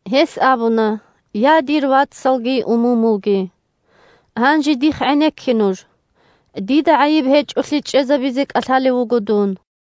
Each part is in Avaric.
Гьес абуна: – Я, дир вацалги умумулги! Гьанже дихъ гӀенекке нуж! Дида гӀайиб гьечӀолъи чӀезабизе кӀалъалев вуго дун.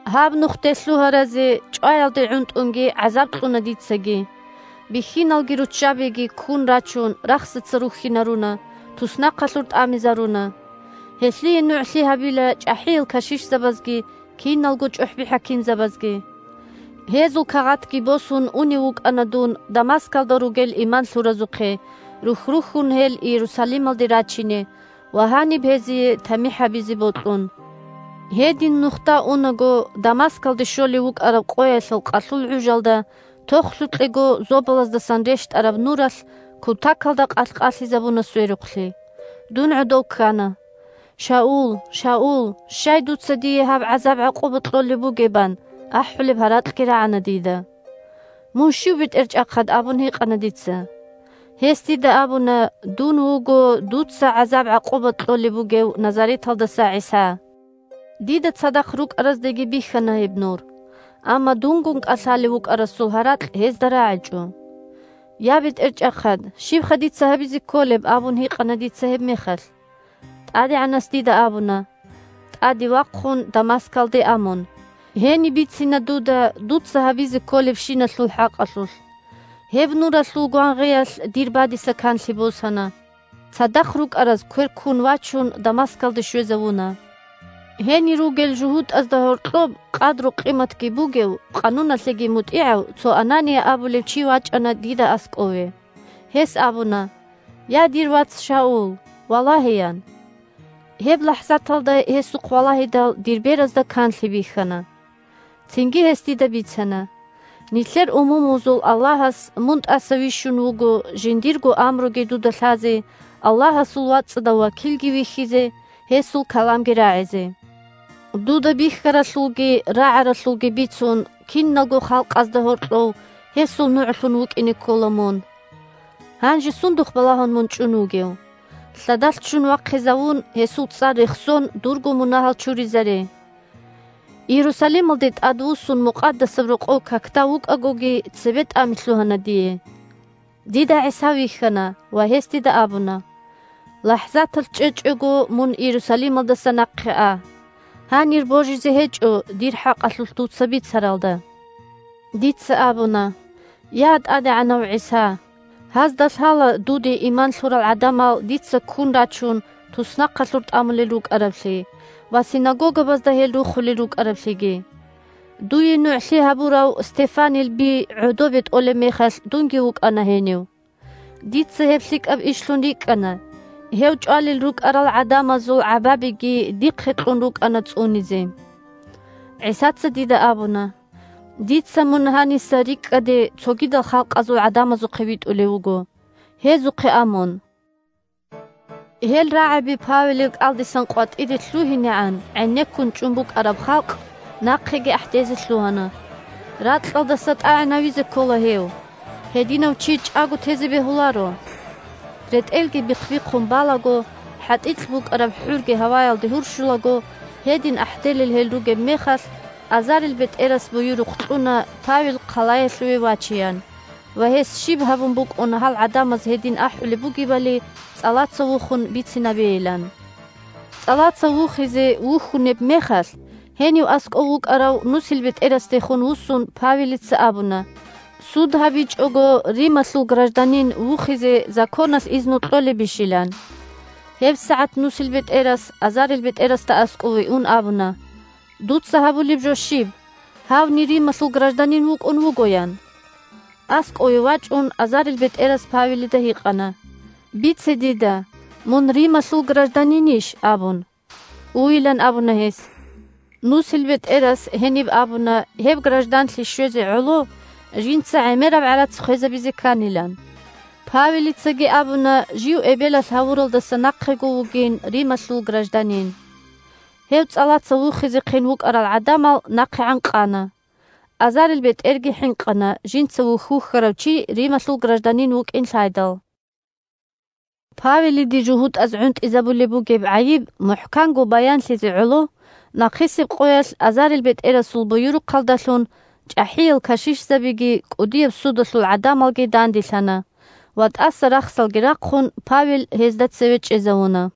Гьаб Нухде лъугьаразе чӀваялде гӀунтӀунги гӀазаб кьуна дицаги, бихьиналги руччабиги, ккун рачун, рахсаца рухьинаруна, туснахъалъур тӀамизаруна. Гьелъие нугӀлъи гьабила чӀахӀиял кашишзабазги киналго чӀухӀби-хӀакимзабазги. Гьезул кагъатги босун унев вукӀана дун Дамаскалда ругел иман лъуразухъе, рухь-рухьун гьел Иерусалималде рачине ва гьаниб гьезие тамихӀ гьабизе бокьун. Гьедин нухда унаго, Дамаскалде щолев вукӀараб къоялъул къалъул гӀужалда, тохлъукьего зобалаздасан рещтӀараб нуралъ кутакалда къалъ-къалъизабуна сверухълъи. Дун гӀодов ккана. «Шаул! Шаул! Щай дуца дие гьаб гӀазаб-гӀакъуба кьолеб бугеб?» – ан ахӀулеб гьаракьги рагӀана дида. «Мун щив, бетӀерчӀахъад?» – абун гьикъана дица. Гьес дида абуна: «Дун вуго дуца гӀазаб-гӀакъуба кьолеб бугев Назареталдаса ГӀиса». Дида цадахъ рукӀараздаги бихьана гьеб нур. Амма дунгун кӀалъалев вукӀарасул гьаракь гьезда рагӀичӀо. «Я, бетӀерчӀахъад! Щибха дица гьабизе кколеб?» – абун гьикъана дица гьебмехалъ. ТӀадегӀанас дида абуна: «ТӀаде вахъун, Дамаскалде а мун. Гьениб бицина дуда дуца гьабизе кколебщиналъул хӀакъалъулъ». Гьеб нуралъул гвангъиялъ дир бадиса канлъи босана. Цадахъ рукӀараз, квер ккун вачун, Дамаскалде щвезавуна. Гьенир ругел жугьутӀазда гьоркьоб къадру-къиматги бугев, къануналъеги мутӀигӀав цо Анания абулев чи вачӀана дида аскӀове. Гьес абуна: «Я, дир вац Шаул! Валагье!» – ян. Гьеб лахӀзаталда гьесухъ валагьидал, дир беразда канлъи бихьана. Цинги гьес дида бицана: «Нилъер умумузул Аллагьас мун тӀаса вищун вуго жиндирго амруги дуда лъазе, Аллагьасул вацӀцӀадав вакилги вихьизе, гьесул каламги рагӀизе. Дуда бихьаралъулги рагӀаралъулги бицун, киналго халкъазда гьоркьов Гьесул нугӀлъун вукӀине ккола мун. Гьанже сундухъ балагьун мун чӀун вугев? Лъадалъ ччун вахъизавун, гьесул цӀар рехсон, дурго мунагьал чуризаре». Иерусалималде тӀадвуссун Мукъадасаб Рокъов какда вукӀагоги цебетӀами лъугьана дие. Дида ГӀиса вихьана, ва гьес дида абуна: «ЛахӀзаталъ чӀечӀого мун Иерусалималдаса нахъе а. Гьанир божизе гьечӀо дир хӀакъалъулъ дуца бицаралда». Дица абуна: «Я, ТӀадегӀанав ГӀиса! Гьазда лъала дуде иман лъурал гӀадамал дица, ккун рачун, туснахъалъур тӀамулел рукӀараблъи ва синагогабазда гьел рухулел рукӀараблъиги. Дуе нугӀлъи гьабурав Стефанил би гӀодобе тӀолеб мехалъ дунги вукӀана гьенив. Дица гьеб лъикӀаб ишлъун рикӀкӀана, гьев чӀвалел рукӀарал гӀадамазул гӀабабиги дихъе кьун рукӀана цӀунизе». ГӀисаца дида абуна: «Дица мун гьаниса рикӀкӀаде цогидал халкъазул гӀадамазухъе витӀулев вуго. Гьезухъе а мун». Гьел рагӀаби Павелил кӀалдиса къватӀире лъугьинегӀан гӀенеккун чӀун букӀараб халкъ нахъеги ахӀдезе лъугьана: – Ракьалдаса тӀагӀинавизе ккола гьев! Гьединав чи чӀаго тезе бегьуларо! РетӀелги бихъ-бихъун балаго, хӀатӀикь букӀараб хӀурги гьаваялде гьурщулаго, гьедин ахӀделел гьел ругеб мехалъ, азарилбетӀерас буюрухъ кьуна Павел хъалаялъуве вачеян ва гьес щиб гьабун букӀун гьал гӀадамаз гьедин ахӀулеб бугебали цӀалаца вухун бицинабейилан. ЦӀалаца вухизе вухьунеб мехалъ, гьенив аскӀов вукӀарав нусилбетӀерасдехун вуссун Павелица абуна суд гьабичӀого Рималъул гражданин вухизе законалъ изну кьолебищилан. ГьебсагӀат нусилбетӀерас, азарилбетӀерасда аскӀове ун, абуна: – Дуца гьабулеб жо щиб? Гьавни Рималъул гражданин вукӀун вуго, – ян. АскӀове вачӀун, азарилбетӀерас Павелида гьикъана: – Бице дида: мун Рималъул гражданинищ? – абун. Уйилан абуна гьес. НусилбетӀерас гьениб абуна гьеб гражданлъи щвезе гӀоло жинца гӀемераб гӀарац хвезабизе кканилан. Павелицаги абуна жив эбелалъ гьавуралдаса нахъего вугин Рималъул гражданин. Гьев цӀалаца вухизехъин вукӀарал гӀадамал нахъегӀан къана. АзарилбетӀерги хӀинкъана жинца вухь-вухьарав чи Рималъул гражданин вукӀин лъайдал. Павелиде жугьутӀаз гӀунтӀизабулеб бугеб гӀайиб мухӀканго баянлъизе гӀоло, нахъисеб къоялъ азарилбетӀерасул буюрухъалдалъун чӀахӀиял кашишзабиги кӀудияб судалъул гӀадамалги данделъана ва, тӀаса рахсалги рахъун, Павел гьезда цеве чӀезавуна.